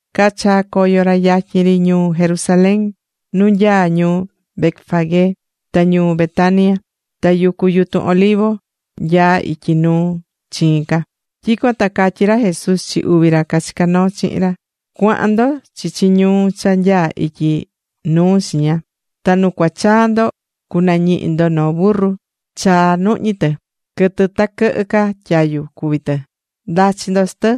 Cachaa̱ coyo ra yatyin ri ñuu Jerusalén, nu nyaá ñuu Betfagé ta ñuu Betania. Ta yucu yutun Olivo nyaá ityi nuu chiin ca. Tyicuan ta catyí ra Jesús chi uvi ra chicá noo chihin ra: ―Cua̱han ndo chichi ñuu cha nyaá ityi nuu chiña. Ta nu cua chaa ndo cunañihi ndo noo burru chaa nuhñí tɨ, quɨtɨ ta quɨhɨ ca tyayu cuví tɨ. Nda̱chi ndo chi tɨ,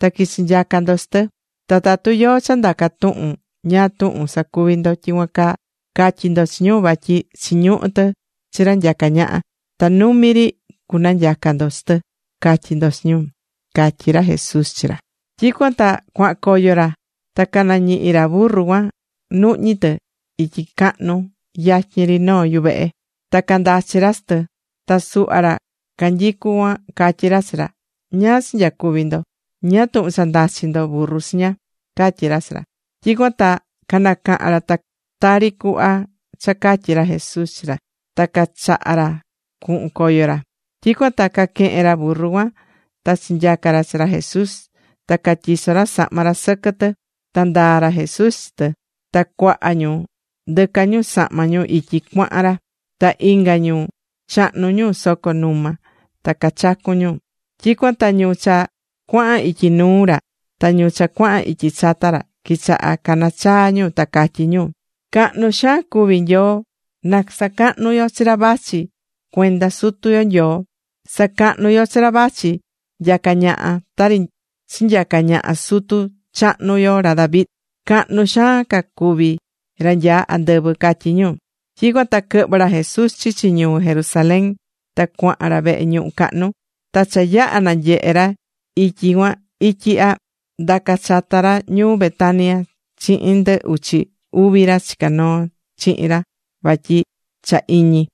ta qui̱chi nyaca ndo chi tɨ. Ta tatu yóó cha ndaca tuhun ñáá tuhun sacuví ndo tyicuan caa, ca̱tyi ndo chi ñu vatyi chiñuhú tɨ chi ra nyacá ñaha, ta numi ri cunanyaca ndo chi tɨ, ca̱tyi ndo chi ñu ―catyí ra Jesús chi ra. Tyicuan ta cuahan coyo ra, ta canañihi̱ ra burru cuan nuhñí tɨ ityi cahnu yatyin ri noo yuvehe, ta candachi̱ ra chi tɨ. Ta suhva ra canyicú cuan catyí ra chi ra: ―¿Ñáá cha nyacuvi ndo? ¿Ñáá tuhun cha ndachí ndo burru chiña? ―catyí ra chi ra. Tyicuan ta canacaha̱n ra tari cuhva cha catyi̱ ra Jesús chi ra. Ta cachaha̱ ra cuhun coyo ra. Tyicuan ta caquehe̱n ra burru cuan ta chinyaca̱ ra chi ra Jesús. Ta catyiso̱ ra sahma ra sɨquɨ tɨ, ta ndaa̱ ra Jesús chi tɨ. Ta cuaha ñu ndɨca ñu sahma ñu ityi cuahan ra, ta inga ñu chahnu̱ ñu soco numa ta cachacu̱n ñu. Tyicuan ta ñu cha cuahan ityi nuu ra ta ñu cha cuahan ityi chata, quichaha̱ cana chaa ñu ta catyí ñu: ―¡Cahnu xaan cuví Nyoo! ¡Na sacahnu yo chi ra vachi cuenda Sutu yo Nyoo! ¡Sa̱cahnu yo chi ra vachi nyacá ñaha tari chinyaca̱ ñaha sutu chahnu yo ra David! ¡Cahnu xaan ca cuví ra nyaá andɨvɨ! ―catyí ñu. Tyicuan ta quɨhvɨ̱ ra Jesús chichi ñuu Jerusalén, ta cuahan ra vehe ñuhu cahnu. Ta cha yaha̱ nanyehe̱ ra ityi cuan ityi ihya, ndaca̱ chata ra ñuu Betania chihin ndɨ uchi uvi ra chicá noo chihin ra vatyi cha iñi.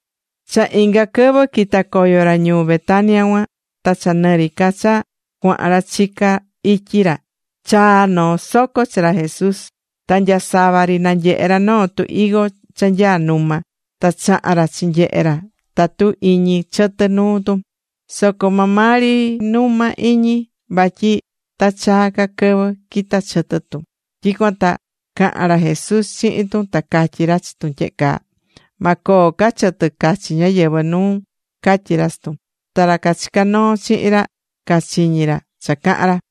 Cha inga quɨvɨ quita̱ coyo ra ñuu Betania cuan, ta cha nɨ ri ca cha cuahan ra chicá ityi ra chaa̱ noo soco chi ra Jesús. Ta nyasava ri nanyehe̱ ra noo tu higo cha nyaá numa. Ta chaha̱n ra chinyehe̱ ra tatu iñi chɨtɨ nuu tun, soco maa maa ri numa ri iñi, vatyi ta chaa ca quɨvɨ quita chɨtɨ tun. Tyicuan ta caha̱n ra Jesús chihin tun, ta catyí ra chi tun tyehe caa: ―Ma coo ca chɨtɨ cachi ñáyɨvɨ nuun ―catyí ra chi tun. Ta ra cachicá noo chihin ra cachiñí ra cha cahán ra.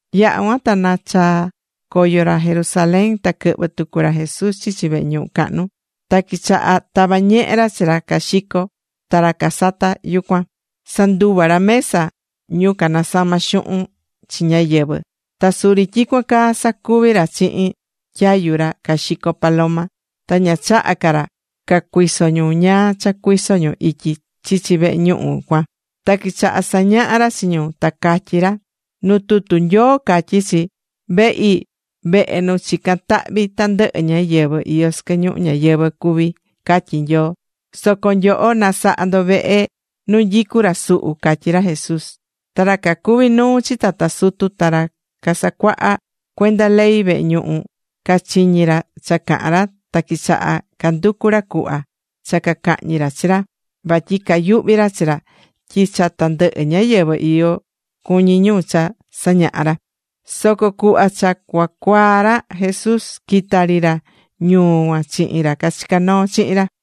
Yaha̱ cuan ta nachaa̱ coyo ra Jerusalén. Ta quɨhvɨ̱ tucu ra Jesús chichi vehe ñuhu cahnu. Ta quichaha̱ tava ñehe ra chi ra caxicó ta ra casatá yucuan. Sanduva̱ ra mesa ñu canasamá xuhun chi ñáyɨvɨ. Ta suri tyicuan caa sacuvi̱ ra chihin tyayu ra caxicó paloma. Ta ña chaha̱ ca ra ca cuiso ñu ñáá cha cuiso ñu ityi chichi vehe ñuhu cuan. Ta quichaha sañaha̱ ra chi ñu, ta catyí ra: ―Nu tutu Nyoo catyí chi: “Vehi, vehe nu chicán tahvi tandɨhɨ ñáyɨvɨ iyó sɨquɨ ñuhu ñayɨvɨ̱ cuví”, catyí Nyoo. ¡Soco nyoho nasahá ndo vehe nu nyicú ra suhu! ―catyí ra Jesús. Ta ra cacuví nuu chi tata sutu ta ra casacuahá cuenda ley vehe ñuhu cachiñi̱ ra cha cahán ra, ta quichaha̱ canducu ra cuhva cha cacahñi ra chi ra vatyi cayuhví ra chi ra tyi cha tandɨhɨ ñáyɨvɨ iyo cuñí ñu cha sañahá ra. Soco cuhva cha cua cuaa ra Jesús quita̱ ri ra ñuu cuan chihin ra cachicá noo chihin ra.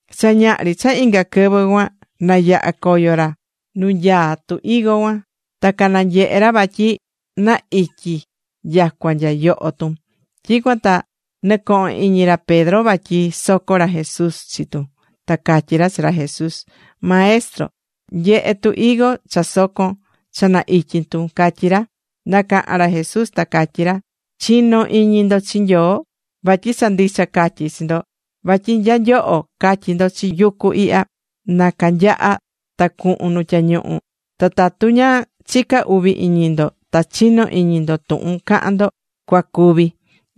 Cha ñaha ri cha inga quɨvɨ cuan, nayaha̱ coyo ra nu nanyaá tu higo cuan. Ta cananyehe̱ ra vatyi na ityi nyacua nya yoho tun. Tyicuan ta nɨcoho̱n iñi ra Pedro vatyi soco̱ ra Jesús chi tun ta catyí ra chi ra Jesús: ―Maestro, nye̱he tu higo cha soco̱n, cha na ityi tun ―catyí ra. Nacaha̱n ra Jesús, ta catyí ra: ―Chi̱no iñi ndo chi Nyoo. Vatyi cha ndicha catyí chi ndo vatyi nya nyoho catyi ndo chi yucu ihya, “Na canyaha ta cuhun nu tyañuhu”, ta tatu ña chicá uvi iñi ndo, ta chinó iñi ndo, tuhun cahan ndo cua cuvi.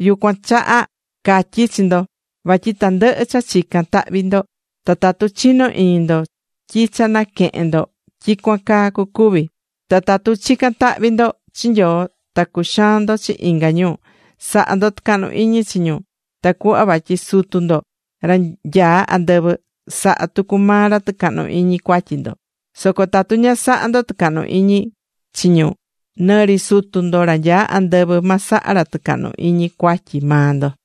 Yucuan chaha catyí chi ndo vatyi tandɨhɨ cha chicán tahvi ndo, ta tatu chinó iñi ndo tyi cha naquehe̱n ndo, tyicuan caa cucuvi. Ta tatu chicán tahvi ndo chi Nyoo ta cuxaán ndo chi inga ñu, sa̱ha ndo tɨcahnu iñi chi ñu, tacuhva vatyi Sutu ndo, ra nyaá andɨvɨ, saha tucu maa ra tɨcahnu iñi cuatyi ndo. Soco tatu ña sahá ndo tɨcahnu iñi chi ñu, nɨ ri Sutu ndo, ra nyaá andɨvɨ, ma saha ra tɨcahnu iñi cuatyi maa ndo.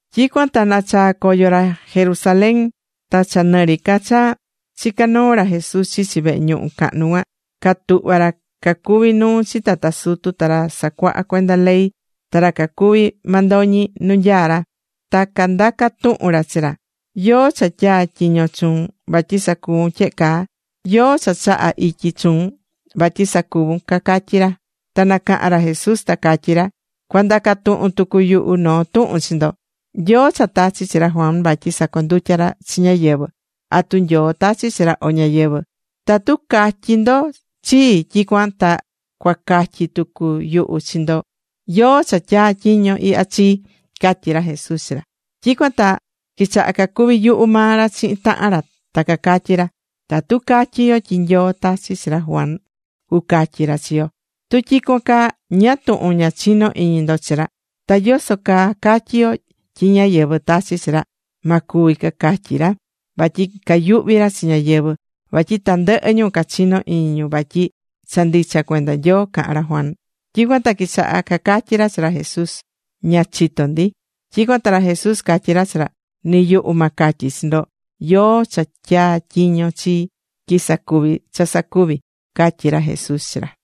Tyicuan ta nachaa̱ coyo ra Jerusalén. Ta cha nɨri ca cha chicá noo ra Jesús chichi vehe ñuhu cahnu cuan, catuhva̱ ra cacuví nuu chi tata sutu, ta ra sacuahá cuenda ley, ta ra cacuví mandoñi nu nyaá ra. Ta candaca̱ tuhun ra chi ra. ―¿Yóó cha tyaa̱ tyiño chuun vatyi sacuvun tyehe caa? ¿Yóó cha chaha̱ ityi chuun vatyi sacuvun? ―cacatyí ra. Ta nacahan ra Jesús, ta catyí ra: ―Cua ndaca tuhun tucu yuhu noo tuhun chi ndo. ¿Yóó cha tachi̱ chi ra Juan vatyi sacondutya ra chi ñáyɨvɨ? ¿Atu Nyoo tachi̱ chi ra, o ñáyɨvɨ? Tatu catyi ndo chii, tyicuan ta cua catyi tucu yuhu chi ndo yóó cha tyatyiño̱ ihya chii ―catyí ra Jesús chi ra. Tyicuan ta quichaha cacuvi yuhu maa ra chihin tahan ra ta cacatyí ra: ―Tatu catyi yo tyi Nyoo tachi̱ chi ra Juan, cucatyi ra chi yo: “Tu tyicuan caa, ¿ñáá tuhun ña chino̱ iñi ndo chi ra?” ¿Ta yoso caa catyi yo tyi ñáyɨvɨ tachi̱ chi ra? Ma cuvi ―cacatyí ra, vatyi cayuhví ra chi ñáyɨvɨ, vatyi tandɨhɨ ñu cachinó iñi ñu vatyi cha ndicha cuenda Nyoo caha̱n ra Juan. Tyicuan ta quichaha cacatyí ra chi ra Jesús: ―Ña chitó ndi. Tyicuan ta ra Jesús catyí ra chi ra: ―Ni yuhu ma catyi chi ndo yóó cha tyaa̱ tyiño chii tyi sacuvi cha sacuví ―catyí ra Jesús chi ra.